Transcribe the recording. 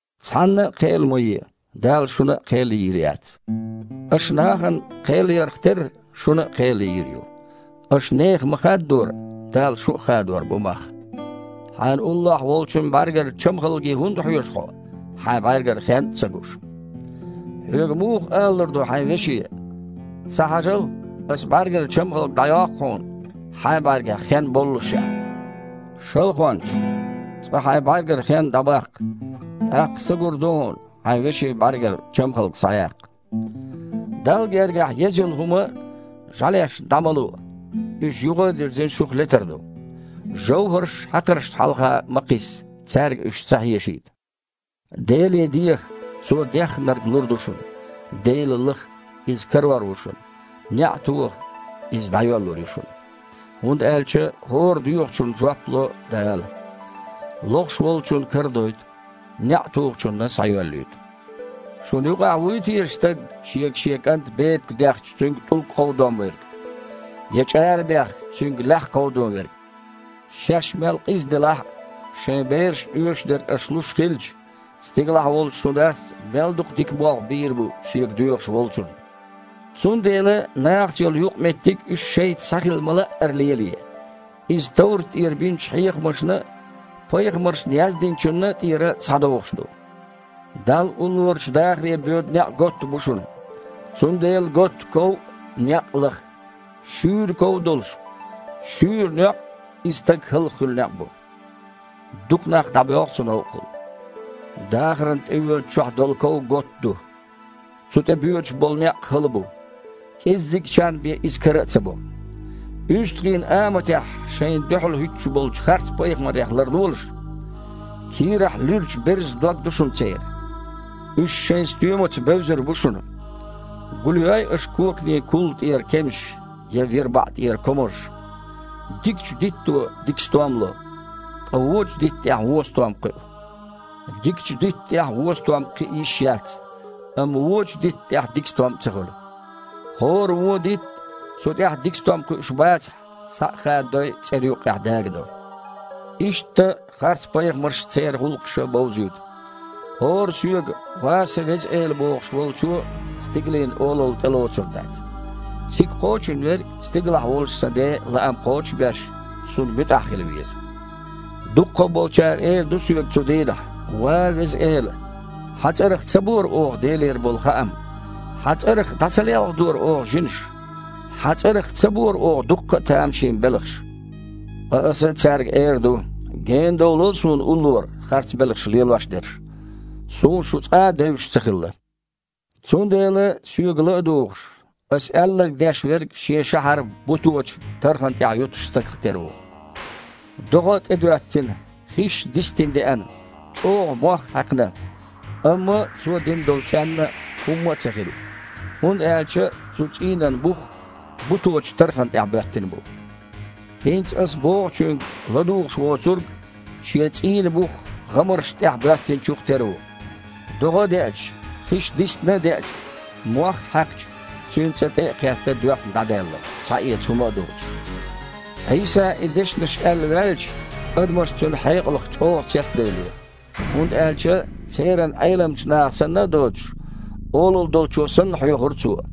«Цхьанна а кхел ма е, Дала шуна а кхел йийр яц. Аша нахана кхел ярх терра, шуна а кхел йийр ю. Аша нехан ма-хаддора, Дала шун а хадор бу мах. Хьайна уллохь волчун бІаьргара чамхалге хІунда хьоьжу хьо, хьайн бІаьргара хен а ца гуш? Хьоьга муха алалур ду хьайн веше: „Схьахьажал, аса бІаьргара чамхалг дІайоккху хьуна“, хьайн бІаьргахь хен боллушехь? Шалхонча, цкъа хьайн бІаьргара хен дІабаккха, тІаккха са гур ду хьуна, хьайн вешин бІаьргара чамхалг схьаяккха. Далла гергахь еза йолу хІума жІаьлеш дІа ма луо, уьш, юха а дирзина, шух летар ду. ЖовхІарш хьакхарчашна хьалха а ма кхисса, цаьрга уьш ца хьешийта». «Деле диэха – Цо дехнарг лур ду шуна. Дела лаха – Иза карор ву шуна, неІ тоха, иза дІайоьллур ю шуна, хІунда аьлча хІора доьхучунна жоп ло Дала, лохуш волчунна карадойту, неІ тухучунна – схьайоьллуьйту. Шуна юкъахь вуй теша стаг, шега шен кІанта бепиг дехча, цуьнга тІулг кховдон верг? Я чІара бехча, цуьнга лаьхьа кховдон верг? Шаьш мел къиза делахь а, шайн берашна оьшург аша луш хилча, стигалахь волчу шун Дас мел дукха дика болх бийр бу Шега доьхуш волчунна! Цундела нахаца йолу юкъаметтиг уьш шайца схьа хила ма-лаъара лелае. Иза товрат тІера бинчу хьехамашна а, пайхамаршна яздинчунна а тІера схьадогІуш ду». «Далла уллорачу дахаре боьду некъ готта бу шуна. Цундела готта ков а, некъ а лаха. Шуьйра ков а долуш, шуьйра некъ – иза стаг хІаллакьхуьлу некъ бу. Дукха нах дІабоьлху цу новкъахула. Дахарна тІевоьдучохь долу ков готта ду, цу тІе боьдуш болу некъ хала бу. КІеззигчарна бен иза кара а ца бо. УьстагІийн аматехь шайна дуьхьал хІуьттуш болчу харц-пайхамарех ларлолаш. Кийрахь луьрачу берзан дог ду шуна церан. Уьш шайн стоьмаца бевзар бу шуна. Гулйой аша коканийн кулла тІера кемсаш, я вирбаІ тІера комарш? Дикачу дитто дика стом ло, ткъа вуочу дитта тІехь вон стом кхуьу. Дикачу дитта тІехь вон стом кхиа а йиш яц, амма вуочу дитта тІехь дика стом а ца хуьлу. ХІора вон дитт, цу тІехь дика стом кхуьуш бацахь, схьа а хададой, цІера юккъехь дагадо. Иштта, харцпайхамарш церан гІуллакхаша бовзуьйту. ХІора Соьга: „Ва сан Веза Эла“ бохуш волчо Стигалийн Олалла тІелоцур дац. Цига кхочун верг стигалахь волчу Сан Ден лаам кхочуш а беш, Цунна муьтІахь хила веза. Дуккха а болчара эр ду Соьга цу дийнахь: „Ва Веза Эла! Хьан цІарах ца бора оха Делера болу хаам? Хьан цІарах дІа ца лелхадора оха жинаш? Хьан цІарах ца бора оха дуккха а тамашийна белхаш?“ Ткъа Аса цаьрга эр ду: „Генадовлал Суна уллора, харц белхаш лелош дерш! Суна шу цкъа а девзаш ца хилла!“» «Цундела Соьга ла а дугІуш, Аса аьлларг деш верг шен шахьар буточу тархана тІехь юттучу стагах тера ву. ДогІа а тІедоьттина, хиш а дистина деана, чІогІа мох а хьаькхна, амма цуо дина долчу цІенна хІумма а ца хилла, хІунда аьлча цу цІийнан бух буточу тархана тІехь боьттина бу. ХІинца Аса бохучуьнга ладугІуш воцург шен цІийнан бух гІамаршна тІехь боьттинчух тера ву. ДогІа а деача, хиш дистина а деача, мох а хьаькхча, цуьнан цІа тІе а кхетта, доьхна дІадаьлла, схьаэца хІума а доцуш». Іийса и дешнаш аьлла ваьлча, адамаш Цуьнан хьекъалх чІогІа цецдевллера, хІунда аьлча церан Іеламчу наха санна а доцуш, олалла долчо санна хьоьхура Цо.